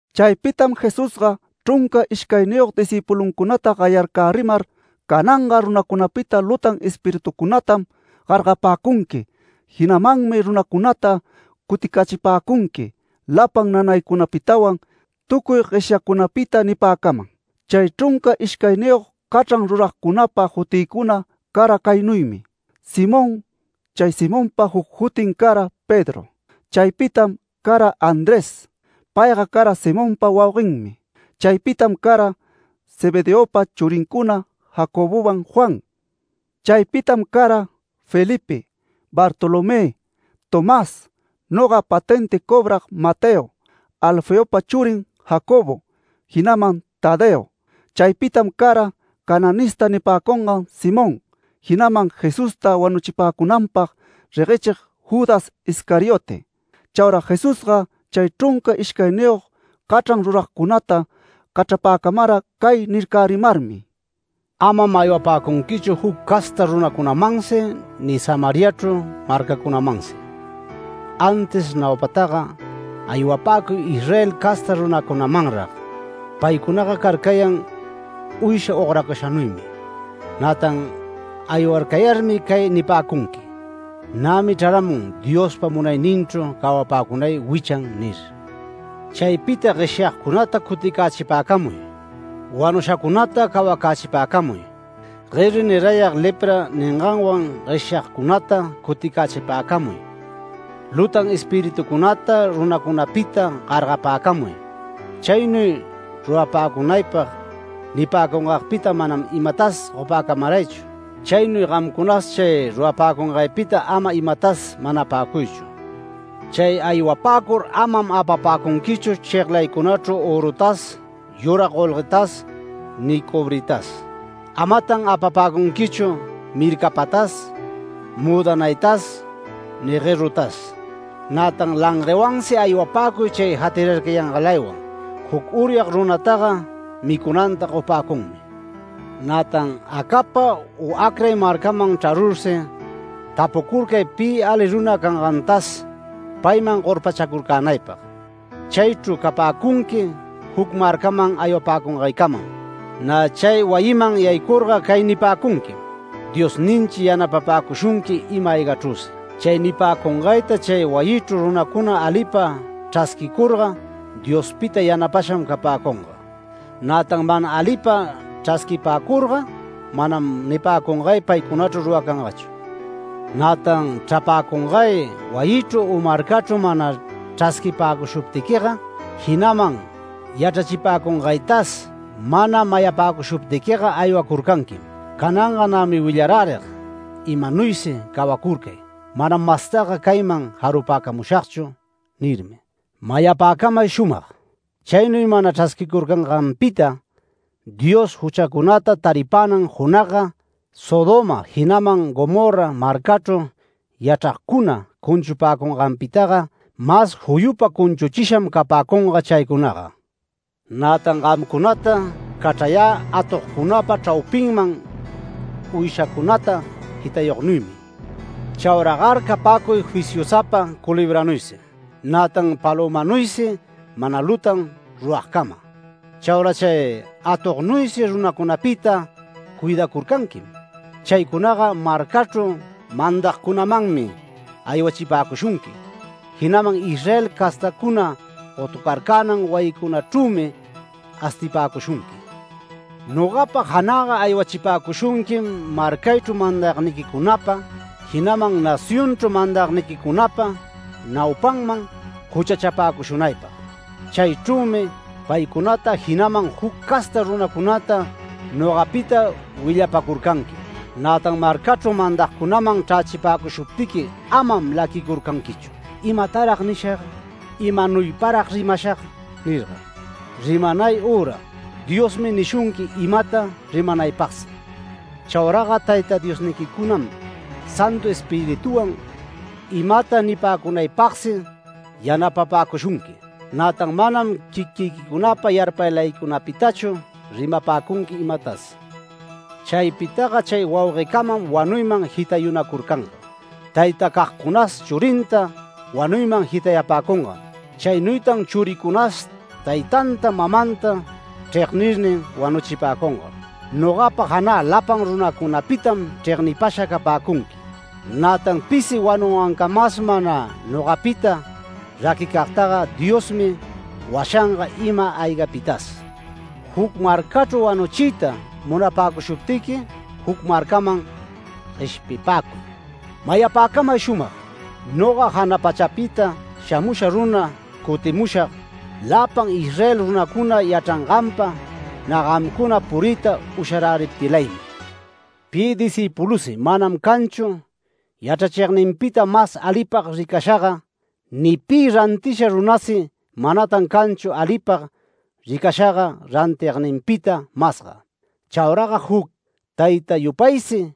Chaypitam Jesusga chrunca ishcayniyog discïpuluncunata gayarcärimar, “Cananga runacunapita lutan espiritucunatam gargapäcunqui, jinamanmi runacunata cuticächipäcunqui lapan nanaycunapitawan tucuy gueshyacunapita” nipäcaman. Chay chrunca ishcayniyog cachran ruragcunapa jutïcuna cara caynuymi: Simón (Chay Simonpam juc jutin cara Pedro). Chaypitam cara Andrés. Payga cara Simonpa wauguenmi. Chaypitam cara Zebedeopa churincuna Jacobowan Juan. Chaypitam cara Felipe, Bartolomé, Tomás, noga patenti cobrag Mateo, Alfeopa churin Jacobo, jinaman Tadeo. Chaypitam cara ‘Cananista’ nipäcungan Simón, jinaman Jesusta wanuchipäcunanpag reguechig Judas Iscariote. Chaura Jesusga chay chrunca ishcayniyog cachran ruragcunata cachrapäcamara cay nircärimarmi: “Amam aywapäcunquichu juc casta runacunamansi ni Samariachru marcacunamansi. Antis naupataga aywapäcuy Israel casta runacunamanrag. Paycunaga carcayan uysha ogracashanuymi. Nätan aywarcayarmi cay nipäcunqui: ‘Nämi chraramun Diospa munayninchru cawapäcunay wichan’ nir. Chaypita gueshyagcunata cuticächipäcamuy, wanushacunata cawacächipäcamuy, gueri nirayag lepra ninganwan gueshyagcunata cuticächipäcamuy, lutan espiritucunata runacunapita gargapäcamuy. Chaynuy rurapäcunaypag nipäcungagpita manam imatas gopäcamaraychu. Chaynuy gamcunas chay rurapäcungaypita ama imatas manapäcuychu. Chay aywapäcur amam apapäcunquichu cheglaycunachru örutas yurag golguetas ni cobritas. Amatan apapäcunquichu mircapatas müdanaytas ni guerutas, nätan languewansi aywapäcuy chay jatirarcayangalaywan. Juc uryag runataga micunanta gopäcunmi. Nätan acapa u acray marcaman chrarursi tapucurcay pi ali runa cangantas payman gorpachacurcänaypag. Chaychru capäcunqui juc marcaman aywapäcungaycamam. Nä chay wayiman yaycurga cay nipäcunquim: ‘Diosninchi yanapapäcushunqui ima-aygachrüsi’. Chay nipäcungayta chay wayichru runacuna alipa chrasquicurga Diospita yanapasham capäcunga. Nätan mana alipa chrasquipäcurga manam nipäcungay paycunachru ruracangachu. Nätan chrapäcungay wayichru u marcachru mana chrasquipäcushuptiquiga. Jinaman yachrachipäcungaytas mana mayapäcushuptiquiga aywacurcanquim. ‘Cananga nämi willarärig imanuysi cawacurcay, manam mastaga cayman jarupäcamushagchu’ nirmi. Mayapäcamay shumag: Chaynuy mana chrasquicurcanganpita Dios juchacunata taripänan junagga Sodoma jinaman Gomorra marcachru yachragcuna cunchupäcunganpitaga mas juyupa cunchuchisham capäcunga chaycunaga”. “Nätan gamcunata cachrayä atogcunapa chraupinman uyshacunata jitayognuymi. Chauragar capäcuy fisyusapa culebranuysi, nätan palömanuysi mana lutan ruragcama. Chaura chay atognuysi runacunapita cuidacurcanquim. Chaycunaga marcachru mandagcunamanmi aywachipäcushunqui, jinaman Israel castacuna gotucarcänan wayincunachrümi astipäcushunqui. Nogapa janäga aywachipäcushunquim marcaychru mandagniquicunapa, jinaman nacionchru mandagniquicunapa naupanman juchachapäcushunaypag. Chaychrümi paycunata jinaman juc casta runacunata nogapita willapacurcanqui. Nätan marcachru mandagcunaman chrächipäcushuptiqui amam laquicurcanquichu ‘¿Imatarag nishag? ¿Imanuyparag rimashag?’ nirga. Rimanay üra Diosmi nishunqui imata rimanaypagsi. Chauraga Tayta Diosniquicunam Santu Espirituwan imata nipäcunaypagsi yanapapäcushunqui. Nätan manam quiquiquicunapa yarpaylaycunapitachu rimapäcunqui imatas. Chaypitaga chay wauguecamam wanuyman jitayanacurcanga. Taytacagcunas churinta wanuyman jitayapäcungam. Chaynuytan churicunasi taytanta mamanta chregnirnin wanuchipäcunga. Nogapa janä lapan runacunapitam chregnipasha capäcunqui. Nätan pisi wanungancamas mana nogapita raquicagtaga Diosmi washanga ima-aygapitas. Juc marcachru wanuchiyta munapäcushuptiqui juc marcaman gueshpipäcuy. Mayapäcamay shumag: Noga jana pachapita shamusha runa cutimushag, lapan Israel runacuna yachranganpa nä gamcuna puriyta usharäriptilaymi. Pi discïpulusi manam canchu yachrachigninpita mas alipag ricashaga ni pi rantisha runasi manatan canchu alipag ricashaga rantigninpita masga. Chauraga juc tayta yupaysi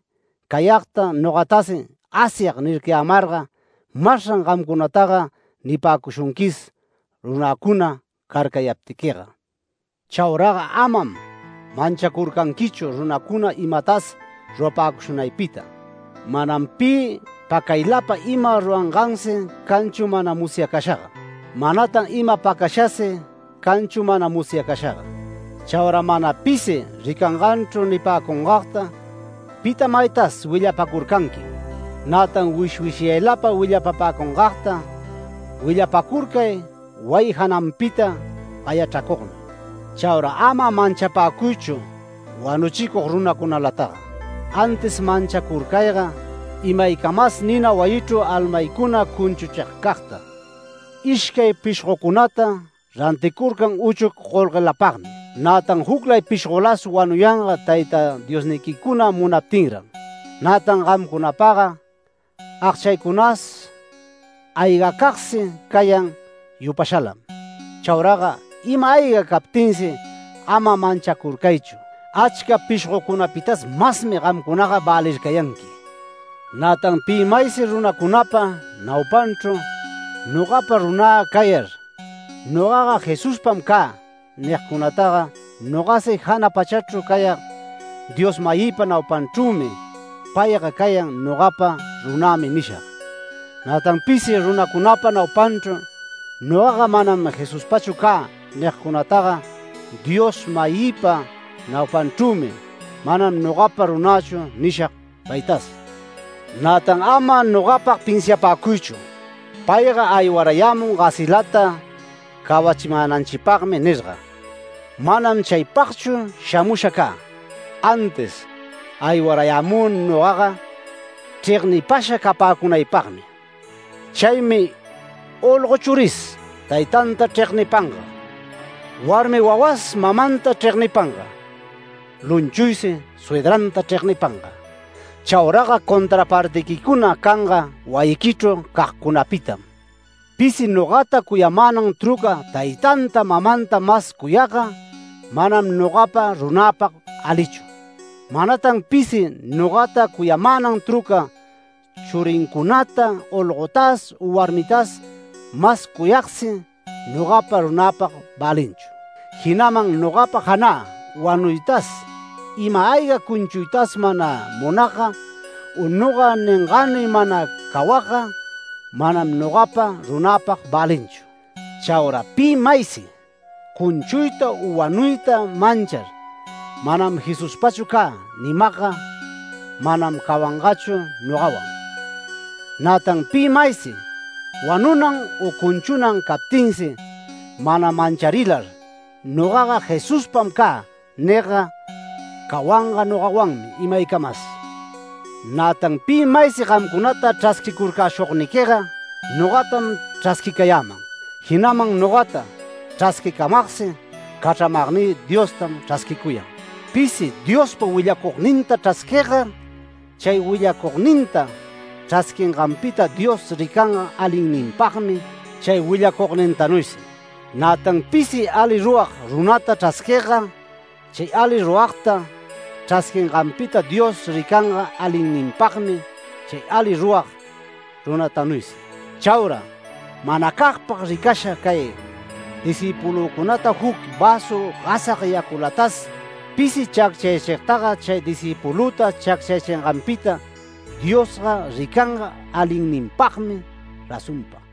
cayagta nogatasi Asyag nircayämarga masran gamcunataga nipäcushunquis, runäcuna carcayaptiquiga”. “Chauraga amam manchacurcanquichu runacuna imatas rurapäcushunaypita. Manam pi pacaylapa ima rurangansi canchu mana musyacashaga. Manatan ima pacashasi canchu mana musyacashaga. Chaura mana pisi ricanganchru nipäcungagta pita maytas willapacurcanquim, nätan wishwishyayla willapapäcungagta willapacurcay wayi jananpita gayachracugnuy. Chaura ama manchapäcuychu wanuchicug runacunalataga. Antis manchacurcayga imaycamas nina wayichru almaycuna cunchuchigcagta. Ishcay pishgocunata ranticurcan uchuc golguelapagmi. Nätan juclay pishgolas wanuyanga Tayta Diosniquicuna munaptinran. Nätan gamcunapaga agchacunas aygacagsi cayan yupashalam. Chauraga ima-ayga captinsi ama manchacurcaychu. Achca pishgocunapitas masmi gamcunaga välircayanqui”. “Nätan pi maysi runacunapa naupanchru nogapa runä cayar ‘Nogaga Jesuspam cä’ nigcunataga nogasi jana pachachru cayag Dios-mayïpa naupanchrümi ‘Payga cayan nogapa runämi’ nishag. Nätan pisi runacunapa naupanchru ‘Nogaga manam Jesuspachu cä’ nigcunataga Dios-mayïpa naupanchrümi ‘Manam nogapa runächu’ nishag paytas. Nätan ama nogapag pinsiapäcuychu ‘Payga aywarayämun gasilata cawachimänanchipagmi’ nirga. Manam chaypagchu shamusha cä. Antis aywarayämü nogaga chregnipasha capäcunaypagmi. Chaymi olgo churis taytanta chregnipanga, warmi wawas mamanta chregnipanga, lumchuysi suydranta chregnipanga. Chauraga contrapartiquicuna canga wayiquichru cagcunapitam. Pisi nogata cuyamänan truca taytanta mamanta mas cuyagga manam nogapa runäpag alichu. Manatan pisi nogata cuyamänan truca churincunata olgotas u warmitas mas cuyagsi nogapa runäpag välinchu. Jinaman nogapa janä wanuytas ima-ayga cunchuytas mana munagga u noga ningänuy mana cawagga, manam nogapa runäpag välinchu. Chaura pi maysi cunchuyta u wanuyta manchar ‘Manam Jesuspachu cä’ nimagga manam cawangachu nogawan. Nätan pi maysi wanunan u cunchunan captinsi mana mancharilar ‘Nogaga Jesuspam cä’ nigga cawanga nogawanmi imaycamas”. “Nätan pi maysi gamcunata chrasquicurcäshugniquiga nogatam chrasquicayäman. Jinaman nogata chrasquicamagsi cachramagnï Diostam chrasquicuyan. Pisi Diospa willacugninta chrasquigga chay willacugninta chrasquinganpita Dios ricanga alinninpagmi chay willacugnintanuysi. Nätan pisi ali rurag runata chrasquigga chay ali ruragta chrasquinganpita Dios ricanga alinninpagmi chay ali rurag runatanuysi. Chaura manacagpag ricasha cay discïpulücunata juc väsu gasag yaculatas pisi chacchayächigtaga chay discïpulüta chacchayächinganpita Diosga ricanga alinninpagmi razonpa”.